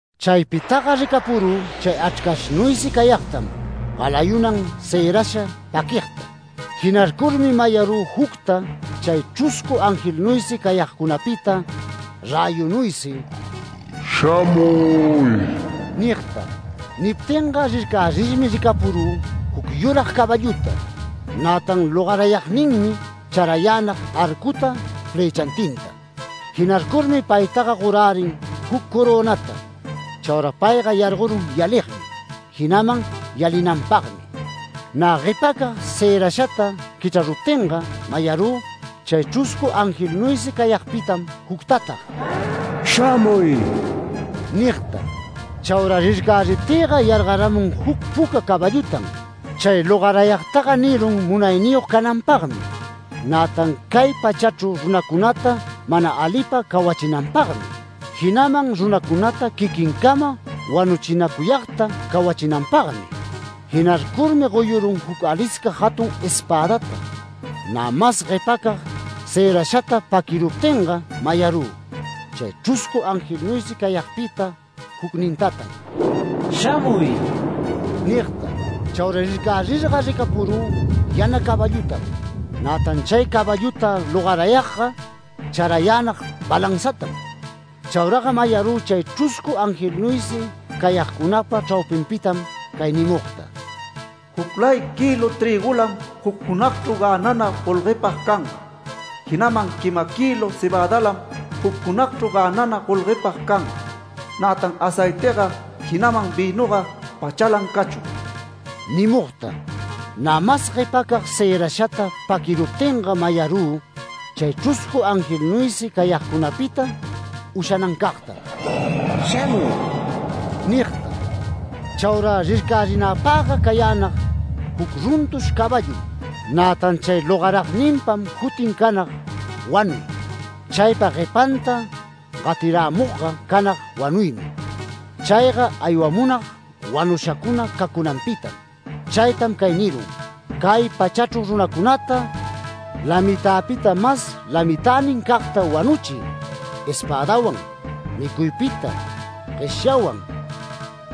Chaypitaga ricapurü chay Achrcashnuysi cayagtam galayunan cërasha paquigta. Jinarcurmi mayarü jucta chay chruscu angelnuysi cayagcunapita räyunuysi “Shamuy” nigta. Niptinga rircärirmi ricapurü, juc yurag caballuta. Nätan logarayagninmi charayänag arcuta flëchantinta. Jinarcurmi paytaga gorärin juc corönata. Chaura payga yargorun yaligmi, jinaman yalinanpagmi. Nä guepacag cërashata quichraruptinga mayarü, chay chruscu angelnuysi cayagpitam juctatag “Shamuy” nigta. Chaura rircäriptïga yargaramun juc puca caballutan. Chay logarayagtaga nirun munayniyog cananpagmi, nätan cay pachachru runacunata mana alipa cawachinanpagmi, jinaman runacunata quiquincama wanuchinacuyagta cawachinanpagmi. Jinarcurmi goyurun juc alisca jatun espädata. Nä mas guepacag cërashata paquiruptinga mayarü, chay chruscu angelnuysi cayagpita jucnintatan “Shamuy” nigta. Chaura rircarirga ricapurü yana caballutam. Nätan chay caballuta logarayagga charayänag balanzatam. Chauraga mayarü chay chruscu angelnuysi cayagcunapa chraupinpitam cay nimugta: “Juclay kïlu trïgulam juc junagchru gänana golguepag canga. Jinaman quima kïlu cebädalam juc junagchru gänana golguepag canga. Nätan aceitiga, jinaman vïnuga pachalan cachun” nimugta. Nä mas guepacag cërashata paquiruptinga mayarü, chay chruscu angelnuysi cayagcunapita ushanancagtam “Shamuy” nigta. Chaura rircarinäpagga cayänag juc runtush caballum. Nätan chay logaragninpam jutin canag ‘Wanuy’. Chaypa guepanta gatirämugga canag wanuymi. Chayga aywamunag wanushacuna cacunanpitam. Chaytam cay nirun: “Cay pachachru runacunata, lamitäpita mas lamitänincagta wanuchiy, espädawan, micuypita, gueshyawan,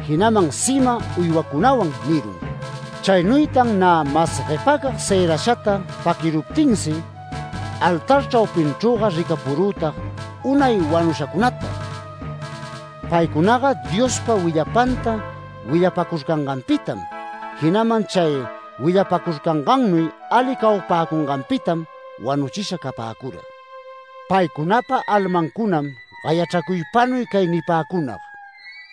jinaman sima uywacunawan” nirun. Chaynuytan nä mas guepacag cërashata paquiruptinsi altar chraquinchrüga ricapurütag unay wanushacunata. Paycunaga Diospa willapanta willapacurcanganpitam, jinaman chay willapacurcangannuy ali cawapäcunganpitam wanuchisha capäcura. Paycunapa almancunam gayachracuypanuy cay nipäcunag: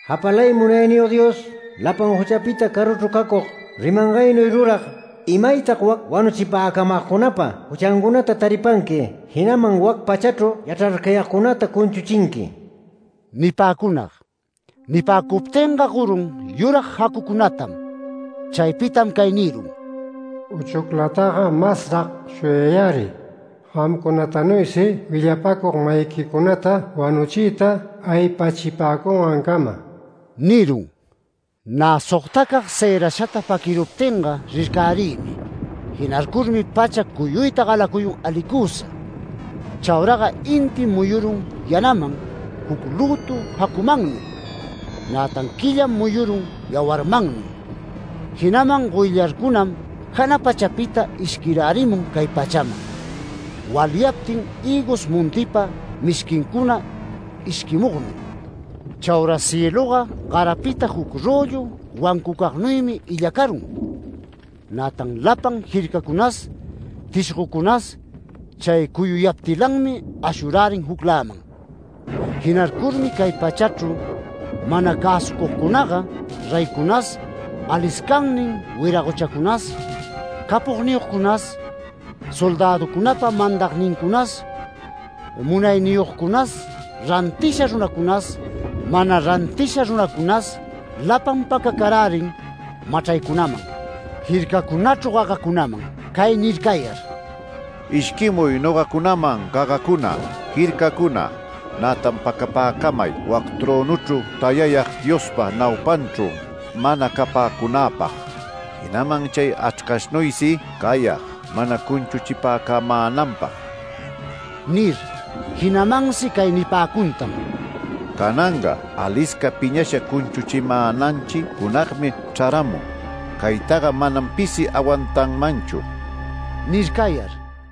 “Japalay Munayniyog Dios, lapan juchapita caruchru cacug, rimangaynuy rurag, ¿Imaytag wac wanuchipäcamagcunapa juchancunata taripanqui, jinaman wac pachachru yachrarcayagcunata cunchuchinqui?” nipäcunag. Nipäcuptinga gorun yurag jacucunatam. Chaypitam cay nirun: “Uchuclataga masrag shuyayäriy. Gamcunatanuysi willapacug-mayiquicunata wanuchiyta aypachipäcungancama” nirun. Nä sogtacag cërashata paquiruptinga rircärïmi. Jinarcurmi pacha cuyuyta galacuyun alicusa. Chauraga intim muyurun yanaman juc lütu jacumannuy. Nätan quillam muyurun yawarmannuy. Jinaman goyllarcunam jana pachapita ishquirärimun cay pachaman. Walyaptin hïgos montipa mishquincuna ishquimugnuy. Chaura cieluga garapita juc röllu wancucagnuymi illacarun. Nätan lapan jircacunas, tishgocunas chay cuyuyaptilanmi ashurärin jucläman. Jinarcurmi cay pachachru mana cäsucugcunaga, reycunas, aliscannin wiragochacunas, capogniyogcunas, soldäducunapa mandagnincunas, munayniyogcunas, rantisha runacunas, mana rantisha runacunas, lapan pacacarärin machraycunaman, jircacunachru gagacunaman cay nirayar: “Ishquimuy nogacunaman gagacuna, jircacuna, nätan pacapäcamay wac trönuchru tayayag Diospa naupanchru mana capäcunäpag, jinaman chay Achrcashnuysi cayag mana cunchuchipäcamänanpag” nir. Jinamansi cay nipäcuntan: “Cananga alisca piñasha cunchuchimänanchi junagmi chraramun. Caytaga manam pisi awantanmanchu” nircayar.